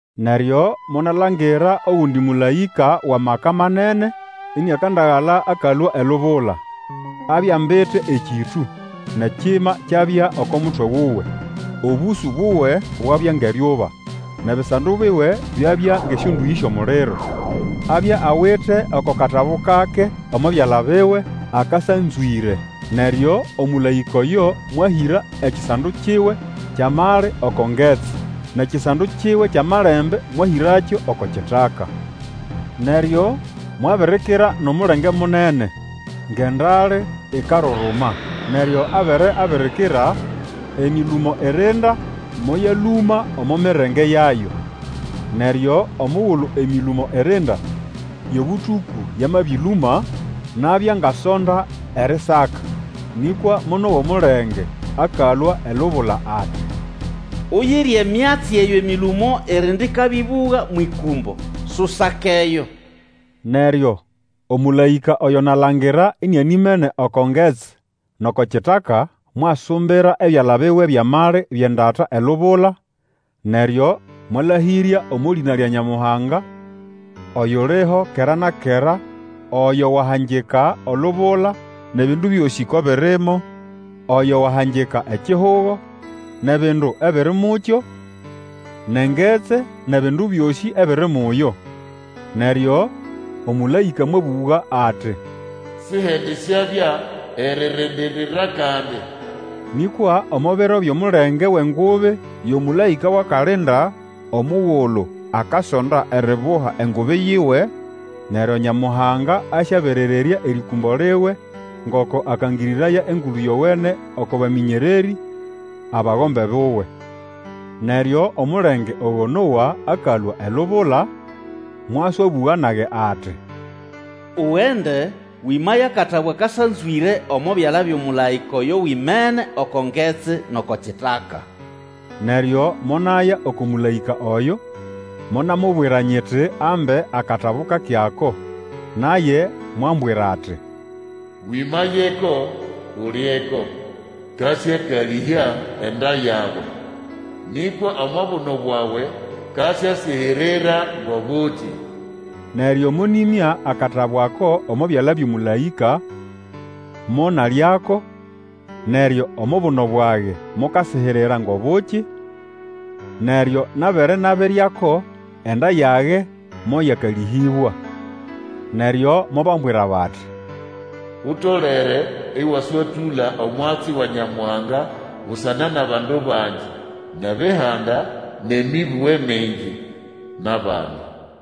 Neryo monalangira ogundi mũlaĩka wʼamaka manene, iniakandagala akalũa elubula. Abya ambite ekĩtũ, nʼekima kyabya oko mutwe wuwe. Obũsũ buwe bwabya ngʼeryuba, nʼebisando biwe byabya ngʼesyondũyĩ syʼomuliro. Abya awite oko katabu kake omo byala biwe, akasanzwĩre. Neryo omũlaĩka oyo mwahĩra ekisando kiwe kyʼamali oko ngetsi, nʼekisando kiwe kyʼamalembe mwahĩrakyo oko kitaka. Neryo mwabirikira nʼomulenge munene, ngʼendale ikaruruma. Neryo abere abirikira, emĩlũmo irinda moyalũma omo mirenge yayo. Neryo omugulu emĩlũmo irinda yʼobũtũkũ yamabĩlũma, nabya ngasonda erisaka. Nĩkwa monowa omulenge akalũa elubula ati, Uyire emyatsi eyo emĩlũmo irinda ĩkabĩbũga mwʼĩkũmbo, susakeyo! Neryo omũlaĩka oyo nalangira inianimene oko ngetsi nʼoko kitaka, mwasumbira ebyala biwe byʼamali byʼendata elubula, neryo mwalahĩrya omo lĩna lya Nyamuhanga, oyuliho kera na kera, oyo wahangika olubula nʼebindu byosĩ ko birimo, oyo wahangika ekihugo nʼebindu ebiri mukyo, nʼengetsi nʼebindu byosĩ ebiri muyo. Neryo omũlaĩka mwabũga ati, Sihendisyabya eririndirira kandi! Nĩkwa omo biro byʼomulenge wʼengubi yʼomũlaĩka wʼakalinda, omugulu akasonda eribuha engubi yiwe, neryo Nyamuhanga asyaberererya erĩkũmbo liwe ngoko akangĩrĩraya Engulu Yowene oko bamĩnyererĩ, abagombe buwe. Neryo omulenge ogo nowa akalũa elubula, mwaswabũga nage ati, Ugende, wĩmaye akatabu akasanzwĩre omo byala byʼomũlaĩka oyo wimene oko ngetsi nʼoko kitaka. Neryo monaya oko mũlaĩka oyo, monamubwira nyiti ambe akatabu kake ako. Naye mwambwira ati, Wĩmayeko, ulyeko. Kasyakalĩhya enda yawe, nĩkwa omo buno bwawe kasyasihirira ngʼobuki. Neryo monĩmya akatabu ako omo byala byʼomũlaĩka, monalyako, neryo omo buno bwage mokasihirira ngʼobuki, neryo nabere nabiryako, enda yage moyakalĩhĩbwa. Neryo mobambwira bati, Utolere ĩwaswatũla omwatsi wa Nyamuhanga busana nʼabandu bangi nʼebihanda, nʼemĩbũge mingi, nʼabami.